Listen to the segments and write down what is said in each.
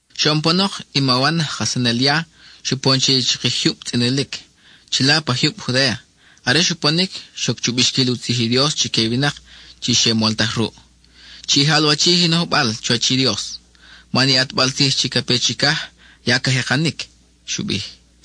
Xoʼon panok, i ma Wan, aj kajsanel ya, xupon che i chakij jyub tzʼinilic, chila pa jyub Judéa. Are xuponic, xoc chu bixquil u tzij i Dios chique i winak chi xe moltaj ruʼ. —Chi jalwachij i nojbal chuwach i Dios —xu bij chique—. Man i ʼatbal tzij chi ca pe chicaj ya ca jekanic —xu bij.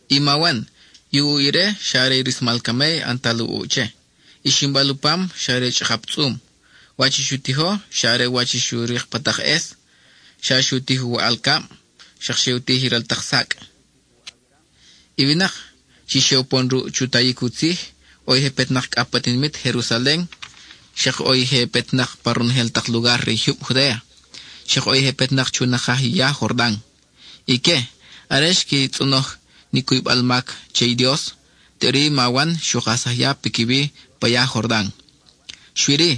I ma Wan, i u ʼuʼ ire xa are i rismal camey ʼantal u ʼuʼ che; i ximbal u pam xa are chʼakap tzʼum. Wach i xu tijo xa are wach i xu rik pa tak ʼes: xa xu tij u waʼal cab, xak xe u tij i ral tak sacʼ. I winak chi xe upon ruʼ chu tayic u tzij, ʼo i je petnak cʼa pa tinimit Jerusalen, xak ʼo i je petnak pa ronojel tak lugar re i jyub Judéa, xak ʼo i je petnak chu nakaj i ya Jordan. Ique, are xqui tzʼonoj ni cuybal mac che i Dios, teʼuri i ma Wan xu kajsaj ya piquiwi pa ya Jordan. Xui-ri,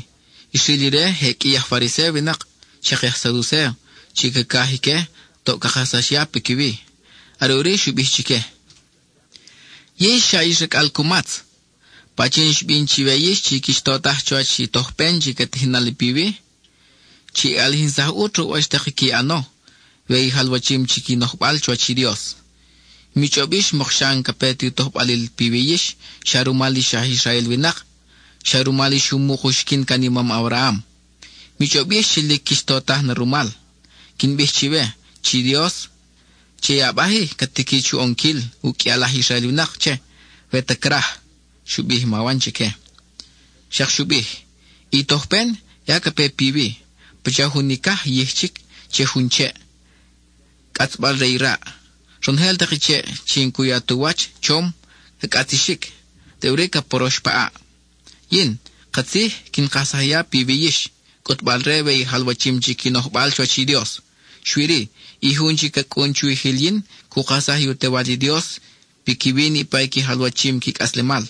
xril ire je qʼui i aj Fariséo winak, xak i aj Saducéo, chi cacaj ique toʼ ca kajsax ya piquiwi. Are ʼuri xu bij chique: —¡Yix xa ix racʼal cumatz! ¿Pachin xbin chiwe yix chi quix totaj chuwach i tojpen chi ca tijin nali piwi? Chi ʼalijinsaj ʼut ruʼ wach tak i qui ʼano we i jalwachim chic i nojbal chuwach i Dios. Mi chʼob yix mok xa n-ca pe tu tojbalil piwi yix xa rumal ix aj Israel winak, xa rumal ix umuk uxiquin can i mam Abraham. Mi chʼob yix chi lic quix totaj na rumal. Quin bij chiwe chi Dios, che i abaj-i, ca tiqui chu ʼonquil uqʼuial aj Israel winak che, we ta craj —xu bij i ma Wan chique. Xak xu bij: —I tojpen ya ca pe piwi, pacha jun icaj yij chic che jun cheʼ, cʼatzbal re i raʼ. Ronojel tak i cheʼ chi n-cu ya tu wach chom, ca cʼatzixic; teʼuri ca porox pa ʼaʼ. Yin, katzij, quin kajsaj ya piwi yix, cʼutbal-re we i jalwachim chic i nojbal chuwach i Dios. Xui-ri, i Jun chi ca cʼun chwijil yin cu kajsaj i u Tewal i Dios piquiwi niʼpa i qui jalwachim qui cʼaslemal;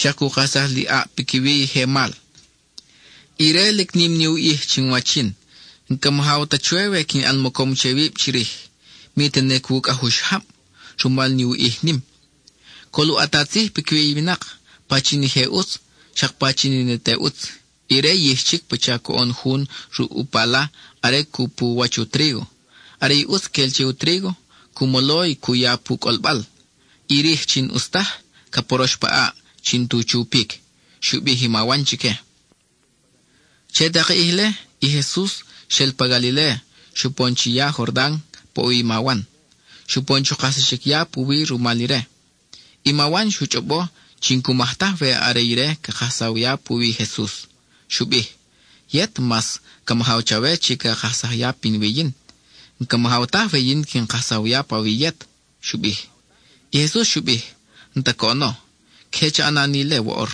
xak cu kajsaj li ʼaʼ piquiwi i je mal. Ire lic nim ni u ʼij chinwach yin; n-ca majaw ta chwe we quin ʼan mocom che wib chirij, mi tene cwucʼaj u xajab, rumal ni u ʼij nim. Col u ʼata tzij piquiwi i winak, pachin i je ʼutz, xak pachin i ne te ʼutz. Ire yij chic pacha coʼon jun ruʼ u pala are cu pu u wach u trígo. Are i ʼutz quel che u trígo, cu molo y cu ya pu cʼolbal. I rij, chi n-ʼus taj, ca porox pa ʼaʼ chi n-tu chupic —xu bij i ma Wan chique. Che tak i ʼij-le, i Jesus xel pa Galiléa, xupon chiya Jordan pa ʼo wi i ma Wan; xupon chu kajsaxic ya puwi rumal ire. I ma Wan xu chʼobo chi n-cu maj taj we are ire ca kajsaw ya puwi i Jesus. Xu bij: —Yet, mas ca majaw chawe chi ca kajsaj ya pinwi yin. N-ca majaw taj we yin quin kajsaw ya pawi yet —xu bij. I Jesus xu bij: —N-ta coʼono. Queje cha ʼana ni ile woʼor,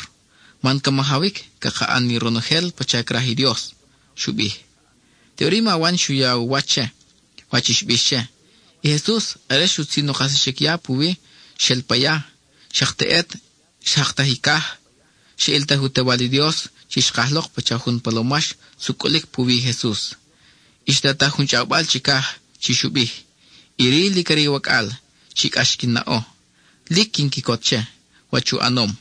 man ca majawic caka ʼan ni ronojel pacha craj i Dios —xu bij. Teʼuri i ma Wan xu ya u wach che, wach i xbix che. I Jesus, are xutzin u kajsaxic ya puwi, xel pa ya. Xak teʼet, xjaktaj i caj, xa ʼiltaj i u Tewal i Dios chi xkaj lok pacha jun palomax sucʼulic puwi Jesus, y xtataj jun chʼawbal chicaj chi xu bij: —Iri lic are i wacʼal chi cʼax quin naʼo; lic quin quicot che, wach u ʼanom.